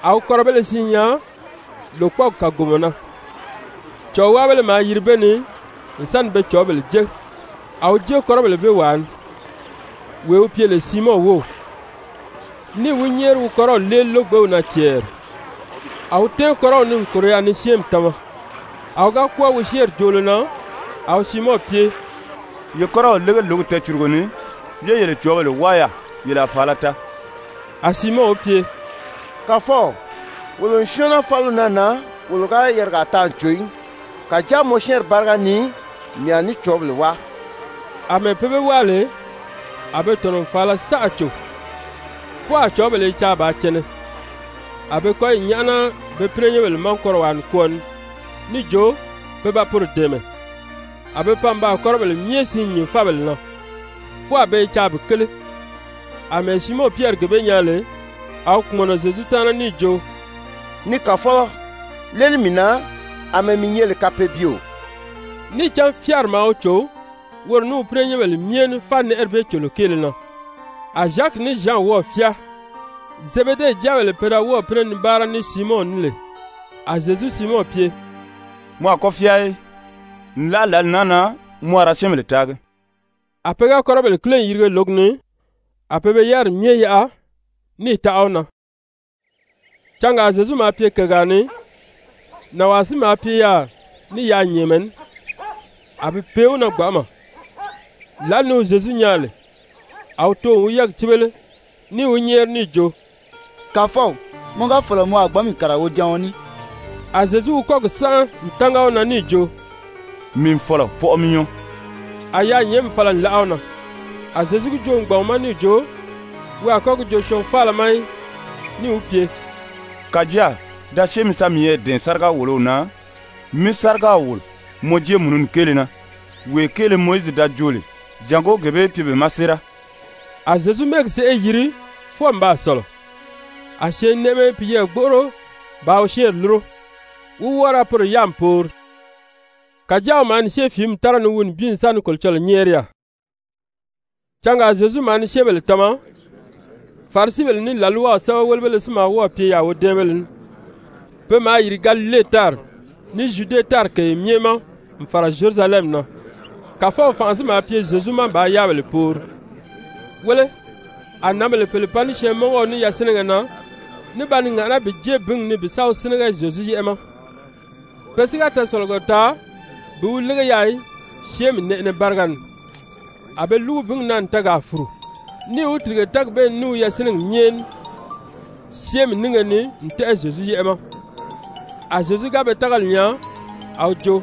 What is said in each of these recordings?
a wi kɔ́rɔbéle siin nyaa lòkpɔɔgi kàgomɔ na, cɔ̀ɔwaabéle maa yiri be ni n sa ni be cɔ̀ɔ́bèle jé. A wi jée kɔ́rɔbèle bee wàa ni, wee wi pye lè Siimɔn wów, níì wi nyɛ́ɛri wi kɔ́rɔw léeli lógbew na cɛɛri. A wi tɛ́ɛn kɔ́rɔw ni n kòro yaà ni syɛ́ɛnmi tama. A wi ga kwɔ́ɔ wi syɛ́ɛnri joolo na, a wi Siimɔn pye: «Ye kɔ́rɔw lége lǒgi tɛɛcùrugo ni, yé yele cɔ̀ɔ́bèle wáa yaà, yele a fàala taa.» A Siimɔn wi pye: «Kàfɔw, wolo n syɔ́ɔn naa fáliw naa na, wolo ga yarigaa taa n cò í. Kàjáa mɔ syɛ́ɛnri báriga ni mii a ní cɔ̀ɔ́bèle wáa.» Amɛɛ pe be wáa lè, a be tɔ̀nɔ n fàala saʔa cò, fwɔɔ a cɔ̀ɔ́bèle i caa bàā cɛnɛ. A be kɔ́yi nyáʔana be pínɛnyɛnbèle ma kɔ́rɔwaa nikwɔɔ ni níì jo pe ba poro dɛ̀ɛmɛ. A be pan n baa kɔ́rɔbèle myɛ siin nyìn fábèle na, fwɔɔ a be i caa bi kéle. Amɛɛ Siimɔn Pyɛri gee bee nyaa lè, a wi kpùmɔnɔ Zyezu taana níì jo: «Ni Kàfɔlɔ, léeli mii na, àmɛɛ mii nyɛ lè kapeebyeo.» Níì cán fyáari maa wi cò woro ní wi pínɛnyɛnbèle myɛ ní fánɛʔɛri bee còlo kéele na. A Zyaki ní Zyan wɔ́ɔ̀ fyáa, Zebede jáabèle pe da wɔ́ɔ̀ pínɛ ni báara ní Siimɔn ní lè. A Zyezu Siimɔn pye: «Mɔ a kɔ́ fyáa í. Nlaʔa lǎli naa na mɔ a ra syɛ́ɛnbèle taagi.» A pe ga kɔ́rɔbèle kíle n yirige lǒgi ni, a be be yáriri myɛ yaʔa, níì taʔa wi na. Cangaa Zyezu maa pye kègaa ni, nànwaa si maa pye yaà ní yaanyɛɛnmɛ ní, a bi pee wi na gbanʔama. Lǎli ni wi Zyezu nyaa lè, a wi too n wi yɛ́ɛgi cíbele, níì wi nyɛ́ɛri níì jo: «Kàfɔw, mɔ ga fɔ̀lɔ mɔ a gbǎn mii kàriga wojaɔn ní.» A Zyezu wi kɔ́gi sánʔa n tánga wi na níì jo: «Mii n fɔ̀lɔ, pɔʔɔ mi nyɔɔ.» A yaanyɛɛnmi fala n láʔa wi na. A Zyezu gi joo n gbàn wi ma níì jo wi a kɔ́ gi joo syɔɔn faala ma í, níì wi pye: «Kàjáa da syée mi sa miyɛɛ dɛ̀ɛn sáriga-wòlow na, mí sárigaw wòlo mɔ jéemununi kéele na, wee kéele Mowizi da joo lè, jàngó gee bee í pye be ma séera.» A Zyezu mɛ́ɛgi sèʔê yiri fwɔɔ n baa sɔ̀lɔ, a syɛɛnnɛʔɛmɛ i piyɛɛ gbóʔoro bàā wi syɛ́ɛnri lúro, wi wɔ́ɔ ra poro yáami poori. Kàjáa wi maa ni syée fìími tára ni wi nibin n sa ni Kolocɔlɔɔ nyɛ́ɛri yaà. Cangaa Zyezu maa ni syɛ́ɛnbèle tama. Farisibèle ní làlwaw sɛ́bɛwelebéle si maa wɔ́ɔ̀ pye yaà wodɛ́ɛnbéle ní. Pe maa yìri Galile tári, ní Zyude tári kèye myɛ ma n fàra Zyerusalɛmi na. Kàfɔw fànʔa si maa pye Zyezu ma bàā yáabèle poori. Wéle, a nǎnbèle pèle pan ní syɛɛnmɔngɔɔ ní yasinɛgɛ na ní ba ni ŋàʔaná bi jée bíngi ni bi sa wi sínɛgɛ Zyezu yɛ́ʔɛ ma. Pe si ga tɛɛsɔ̀lɔgɔ taa bi wi lége yaà í syɛ́ɛnmi nɛʔɛnɛ báriga ni. A be lúgu bíngi na n tɛɛgaa fùru, níì wi tìrige tɛ́ɛgi bee ni ní wi yasinɛgi myɛ ní syɛ́ɛnmi nínge ni n tɛ́ʔɛ Zyezu yɛ́ʔɛ ma. A Zyezu ga be tágali nyaa, a wi jo: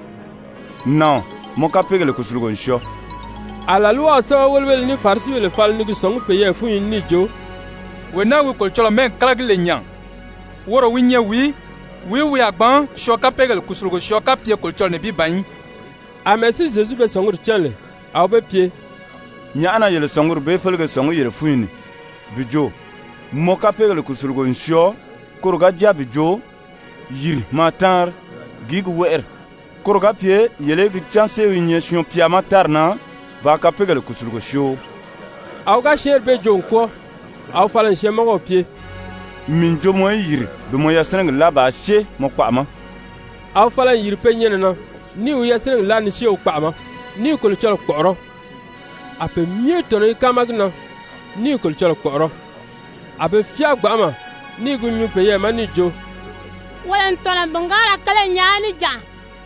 «Nàɔn, mɔ kapeegèle kùsulugo n syɔɔ.» A làlwaw sɛ́bɛwelebéle ní Farisibèle fala ni gi sɔ̀ngí peyɛɛ fúnyi ni níì jo: «Wee naa wi Kolocɔlɔɔ mɛ́ɛgi kálagi lè nya, woro wi nyɛ wìí? Wìí wi a gbǎn syɔɔn kapeegèle kùsulugo syɔɔ kapye Kolocɔlɔɔ nibin ban í?» Amɛɛ si Zyezu be sɔ̀nguri cán lè, a wi be pye: «Nyàʔá na yele sɔ̀nguri bee félege sɔ̀ngí yele fúnyi ni? Bi jo: ‹Mɔ kapeegèle kùsulugo n syɔɔ,› koro ga jáa bi jo: ‹Yìri maa táanri,› gìí gi wɛ́ʔɛri? Koro ga pye yele í gi cán séew i nyɛ Syɔɔn-pya ma tári na bàā kapeegèle kùsulugo syoo.» A wi ga syɛ́ɛnri bee joo n kwɔ́ɔ, a wi fala n syɛɛnmɔngɔw pye: «Mii n jo mɔ í yìri bi mɔ yasinɛgi láa bàā syée mɔ kpaʔa ma.» A wi fala n yìri pe nyɛnɛ na, níì wi yasinɛgi láa ni syée wi kpaʔa ma, ní i Kolocɔlɔɔ kpɔ̀ʔɔrɔ́. A pe myɛ tɔ̀nɔ i káama gi na, ní i Kolocɔlɔɔ kpɔ̀ʔɔrɔ́. A be fyáa gbanʔama ní i gi nyuu peyɛɛ ma níì jo: «Wolo n tɔ̀nɔ n bìngaara kele nyaa níjanʔa.»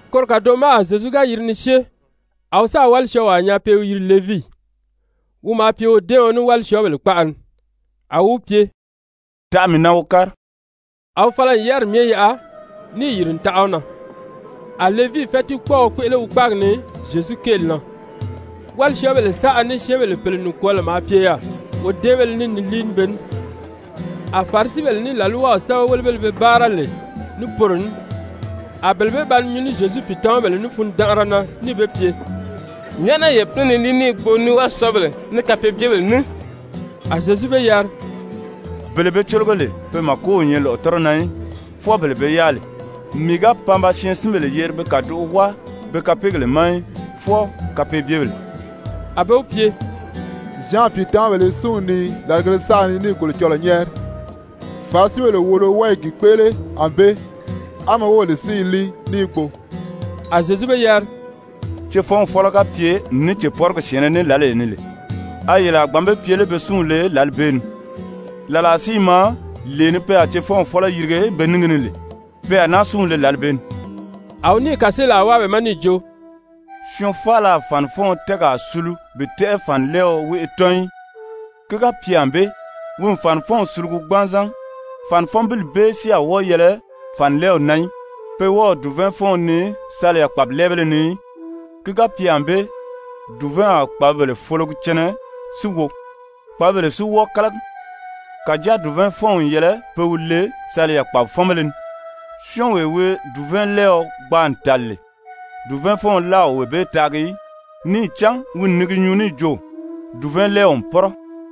Koro kàdoʔo ma a Zyezu ga yiri ni syée, a wi sáà wálisyɔɔwaa nyaa pe i wi yiri Levii. Levii: Pe wɔ́ɔ i Levii yiri Matye. Wi maa pye wodɛ́ɛɔn ní wálisyɔɔbèle kpaʔa ni. A wi wi pye: «Taʔa mii na wo kári.» A wi fala n yáriri myɛ yaʔa, níì yìri n taʔa wi na. A Levii fɛ́tiikpɔɔɔ kpéʔele wi kpáagi ni Zyezu kéeli na, wálisyɔɔbèle saʔa ní syɛ́ɛnbèle pèle nikwɔɔlɔ maa pye yaà wodɛ́ɛnbéle ní ni líi ní be ní. A Farisibèle ní làlwaw sɛ́bɛwelebéle be báara lè ní poro ní, a bele bee ba ni nyuu ní Zyezu pìitamabèle ní fundanʔara na níì be pye: «Nyàʔá na yele pínɛ ni líi ní i gbo ní wálisyɔɔbèle, ní kapeebyebèle ní?» A Zyezu be yari: «Bele be cólogo lè, pe màko o nyɛ lɔ̀ʔɔtɔrɔ na í, fwɔɔ bele be yáa lè. Mii ga pan ba syɛɛnsinbèle yeri be kàdoʔo wáa be kapeegèle ma í, fwɔɔ kapeebyebèle.» A be wi pye: «Zyan pìitamabèle i súnw nii làrigèle saʔa ni ní i Kolocɔlɔɔ nyɛ́ɛri, Farisibèle wòolo wɔ́ɔ i gi kpéʔele ànbée, á mɔ wóbèle si i líi ní i gbo.» A Zyezu be yari: «Cefɔnw fɔ́lɔ ga pye ní wi cèpɔrigi syɛ̀ɛnnɛ ní lǎlee ni lè, a yele a gbǎn be pye lé pe súnw le lǎli bee ni? Làlaa si i maa, lee ni pe a cefɔnw fɔ́lɔ yirige be níngi ni lè, pe a náa súnw le lǎli bee ni.» A wi níì kàseelaa wáa be ma níì jo: «Syɔɔn faala a fànifɔɔn tɛ́ɛgaa sulu bi tɛ́ʔɛ fànilɛɛɔ wéʔe tɔ́n í. Ki ga pye ànbée, wi n fànifɔnw sulugu gbanzan, fànifɔnbili bee si a wɔ́ɔ yɛlɛ fànilɛɛw na í. Pe wɔ́ɔ o dùvɛɛnfɔɔn nii saliya kpàbilɛɛbéle ni í. Ki ga pye ànbée, dùvɛɛnw a kpàbibèle fologi cɛnɛ si wo, kpàbibèle si wɔ́ɔ kálagi. Kàjáa dùvɛɛnfɔnw n yɛlɛ pe wi le saliya kpàbifɔnbéle ni. Syɔ́ɔnwee wi dùvɛɛnlɛɛɔ gbaa n tàli lè, dùvɛɛnfɔɔn láa o wee bee taagi í, níì cán wi n ni gi nyuu níì jo: ‹Dùvɛɛnlɛɛw n pɔ́rɔ.›»